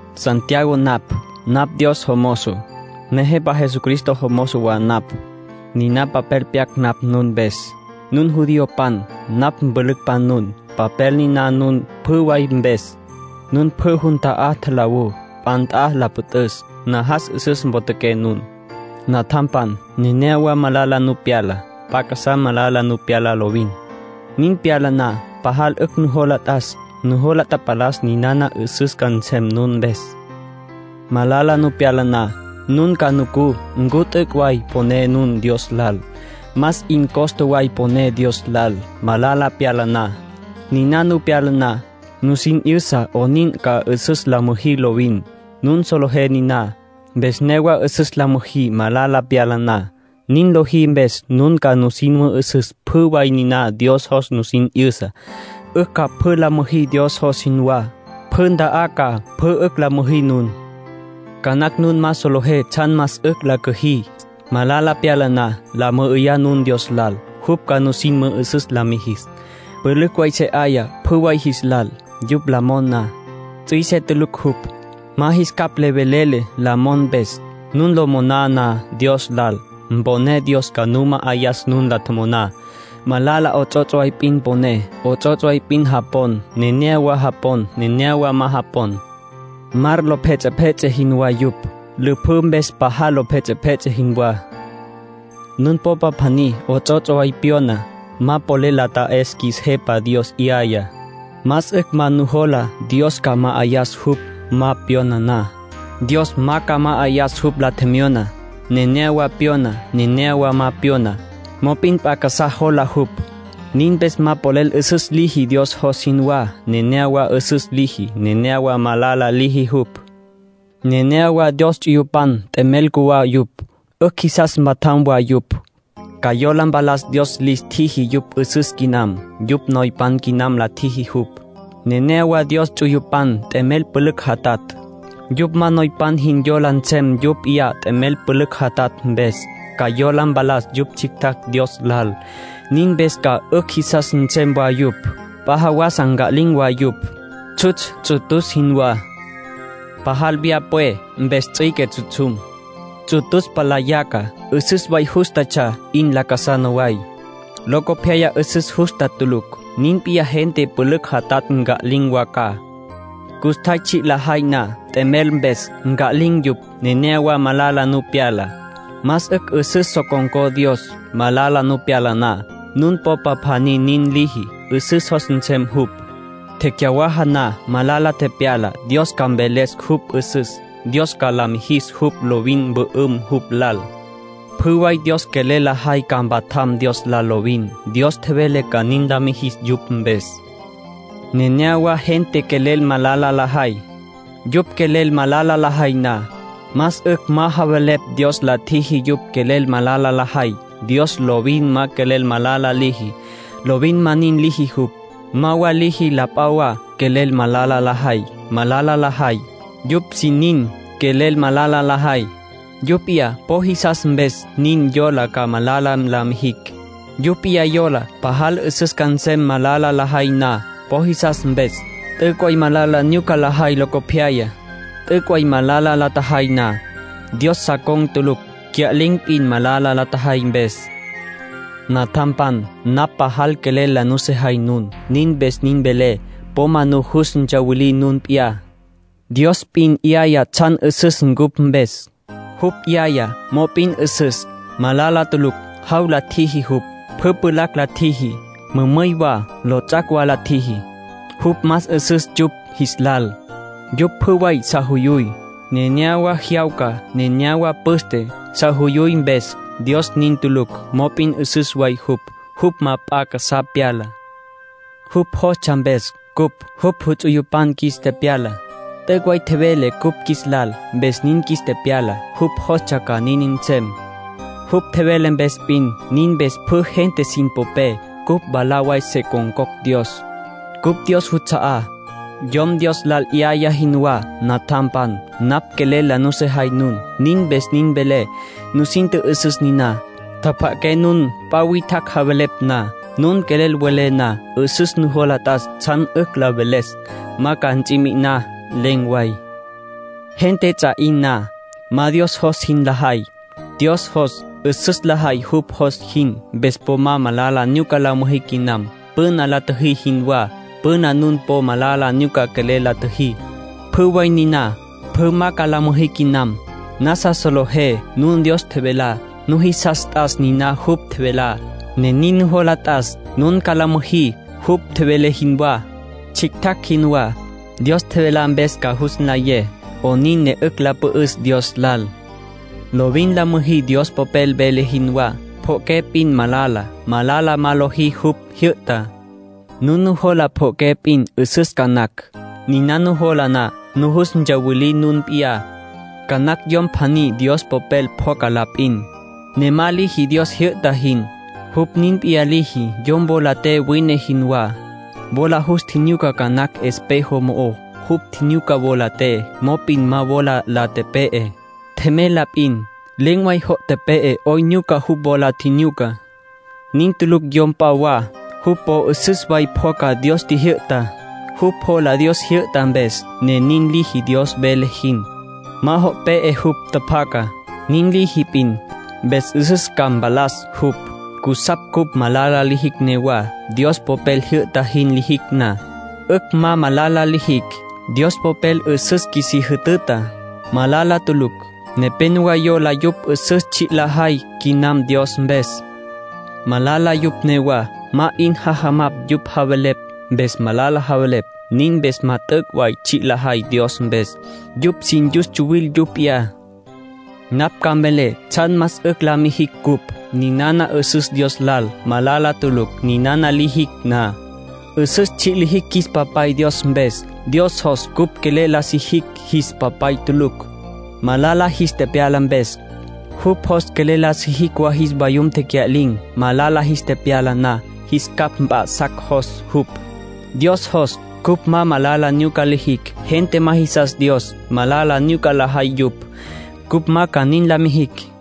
Santiago napj. Napj Dios jomozo, Nejepa Jesucristo jomozo wa napj. Niná papel pyac napj nun mpes, nun judiopan, napj mpülücpan nun. Papel niná nun pjü way mpes, nun pjü jun ta'á tjalawú, p'a nt'a la püt'üs. Najas 'üsüs potjaqué nun. Natjampan, nenéyawa malala nu pyala. P'a casá malala nu pyala lovin. Nin pyala na, pajal 'ücj nujos t'as. Nujola tapalas ninana 'üsüs ca nsem nun mpes. Malala nu pyala na, nun ca nucú ncu t'üc' way poné nun Dios lal. Más 'in costa way poné Dios lal, malala pyala na. Niná nu pyala na, nusin 'yüsa 'onin ca 'üsüs la müjí lovin. Nun solejé niná mpes newa 'üsüs la müjí malala pyala na. Nin lojí mpes nun ca nusin mü'üsüs pjü way niná Dios jos nusin 'yüsa. 'Ücj ca pjü la müjí Dios jos jinwá. Pjü nta'á ca pjü 'ücj la müjí nun. Ca nacj nun ma solejé tsjan más 'ücj la cüjí, malala pyala na. La mü'üyá nun Dios lal. Jupj ca nusin mü'üsüs la mijis. Pülücj way se 'aya pjü way jis lal, yupj la mon na. Ts'üise tulucj jupj. Ma jis capj velele la mon mpes. Nun lo moná na Dios lal, mponé Dios ca nu ma'ayas nun la tjomoná. Malala 'ots'ots' way p'in poné. 'Ots'ots' way p'in japon, nenéyawa japon, nenéyawa ma japon. Mar lo pjets'epjets'e jinwá yupj, lüpjǘ mpes pajal lo pjets'epjets'e jinwá. Nun popa pjaní 'ots'ots' way pyona, ma polel la ta'es qjuis Jepa Dios 'yayá. Más 'ücj ma jola Dios ca ma'ayas jupj ma pyona na. Dios ma ca ma'ayas jupj la tjemyona. Nenéyawa pyona, nenéyawa ma pyona. Mop'in p'a casá jola jupj. Nin mpes ma polel 'üsüs liji Dios jos jinwá. Nenéyawa 'üsüs liji, nenéyawa malala liji jupj. Nenéyawa Dios ts'uyupan t'emel cjuwá yupj. 'Ücj jisas mpatjam wa yupj. Ca yola mpalas Dios lis tjiji yupj 'üsüs quinam, yupj noypan quinam la tjiji jupj. Nenéyawa Dios ts'uyupan t'emel pülücj jatatj. Yupj ma noypan jin yola nsem yupj p'iyá t'emel pülücj jatatj mpes. Ca yola mpalas yupj tsjictjacj Dios lal, nin mpes ca 'ücj jisas nsem wa yupj. P'a jawasa nca'lin̈ wa yupj, tsjutsj ts'utus jinwá. Pajal vyaja pwe mpes ts'üique tsjutsjum. Ts'utus palá yaca. 'Üsüs way jústatsja 'in lacasana way; locopyaya 'üsüs justa tulucj. Nin p'iyá gente pülücj jatatj nca'lin̈ wa ca. Custjay tsji' lajay na t'emel mpes, nca'lin̈ yupj. Nenéyawa malala nu pyala. Más 'ücj 'üsüs so con̈có Dios, malala nu pyala na. Nun popa pjaní nin liji, 'üsüs jos nsem jupj. Tecyawaja na malala tepyalá, Dios ca mveles jupj 'üsüs. Dios ca la mijis jupj lovin mpü'üm jupj lal. Pjü way Dios quelel lajay ca mpatjam Dios lal lovin. Dios tjevele ca nin la mijis yupj mpes. Nenéyawa gente quelel malala lajay. Yupj quelel malala lajay na, más 'ücj ma javelepj Dios la tjiji yupj quelel malala lajay. Dios lovin ma quelel malala liji; lovin ma nin liji jupj. Ma wa liji la p'a wa quelel malala lajay. Malala lajay, yupj sin nin quelel malala lajay. Yupj p'iyá po jisas mpes nin yola ca malala la mijicj. Yupj p'iyá yola pajal 'üsüs ca nsem malala lajay na. Po jisas mpes, t'üc' way malala nyuca lajay locopyaya. T'üc' malala la tjajay na, Dios sa con̈ tulucj. Cya'lin̈ p'in malala la tjajay mpes. Natjampan, napj pajal quelel la nusejay nun. Nin mpes nin velé. Po ma nujus ntsawilí nun p'iyá. Dios p'in 'yaya tsjan 'üsüs cupj mpes. Jupj 'yayá, mop'in 'üsüs, malala tulucj. Jaw la tjiji jupj. Pjü pjulacj la tjiji. Mümüy wa, lots'ac' wa la tjiji. Jupj más 'üsüs yupj jis lal. Yupj pjü way sa juyuy. Nenéyawa jyawca, nenéyawa püste, sa juyuy mpes. Dios nin tulucj. Mop'in 'üsüs way jupj. Jupj ma p'a casá pyala. Jupj jostsja mpes cupj jupj ts'uyupan qjuis tepyala. T'üc' way tjevele cupj qjuis lal, mpes nin qjuis tepyala. Jupj jostsja ca nin nsem, jupj tjevele mpes p'in. Nin mpes pjü gente sin popé, cupj mwalá way se con̈cocj Dios. Cupj Dios juts'a'á, yom Dios lal 'yayá jinwá. Natjampan, napj quelel la nusejay nun. Nin mpes nin velé. Nusin tjü'üsüs niná. Tjapja'aqué nun p'a witjacj javelepj na. Nun quelel welé na, 'üsüs nujola t'as tsjan 'ücj la veles. Ma ca ts'i mi'iná len̈ way. Gente ts'a 'in na, ma Dios jos jin lajay. Dios jos 'üsüs lajay jupj jos jin. Mpes po ma malala nyuca la müjí quinam, püna la tjüjí jinwá. Püna nun po malala nyuca quelel la tjüjí. Pjü way niná, pjü ma ca la müjí quinam. Nasa solejé nun Dios tjevelá. Nujisas t'as niná jupj tjevelá, ne nin nujola t'as nun ca nin la müjí jupj tjevele jinwá, tsjictjacj jinwá. Dios tjevelá mpes ca jus nlayé 'onin ne 'ücj la püt'üs Dios lal. Lovin la müjí Dios Popel vele jinwá. Pjo'oqué p'in malala. Malala ma lojí jupj jyü'tá. Nun nujola pjo'oqué p'in 'üsüs ca nacj. Niná nujola na, nujus tsuwilí nun p'iyá. Ca nacj yom pjaní Dios Popel pjoca la p'in, ne ma liji Dios jyü'ta jin. Jupj nin p'iyá liji yom wola te wine jinwá. Wola jus tjinyuca ca nacj espejo mo'ó. Jupj tjinyuca wola te, mop'in ma wola la tepe'e. Tjemey la p'in. Len̈ way jo' tepe'e 'oyn nyuca jupj wola tjinyuca. Nin tulucj yom p'a wa, jupj po 'üsüs way pjoca Dios tjijyü'tá. Jupj jola Dios tjijyü'ta mpes, ne nin liji Dios vele jin. Ma jo' pe'e jupj tjapjacá. Nin liji p'in, mpes 'üsüs ca mpalas jupj. Cusapj cupj malala lijicj newa. Dios Popel jyü'ta jin lijicj na, 'ücj ma malala lijicj. Dios Popel 'üsüs qjuisí jütüta, malala tulucj. Nepénowa yola yupj 'üsüs tsji' lajay quinam Dios mpes, malala yupj newá. Ma 'in jajamapj yupj javelepj, mpes malala javelepj. Nin mpes ma t'üc' way tsji' lajay Dios mpes. Yupj sin yus tsuwil yupj p'iyá. Napj ca mvelé tsjan más 'ücj la mijicj cupj. Ninana 'üsüs Dios lal, malala tulucj. Ninana lijicj na, 'üsüs tsji' lijicj qjuis Papay Dios mpes. Dios jos cupj quelel la sijicj jis papay tulucj, malala jis tepyala mpes. Jupj jos quelel la sijicj wa jis vayum tecya'lin̈, malala jis tepyala na. Jis capj mp'a'sacj jos jupj. Dios jos cupj ma malala nyuca lijicj. Gente ma jisas Dios, malala nyuca lajay yupj; cupj ma ca nin la mijicj.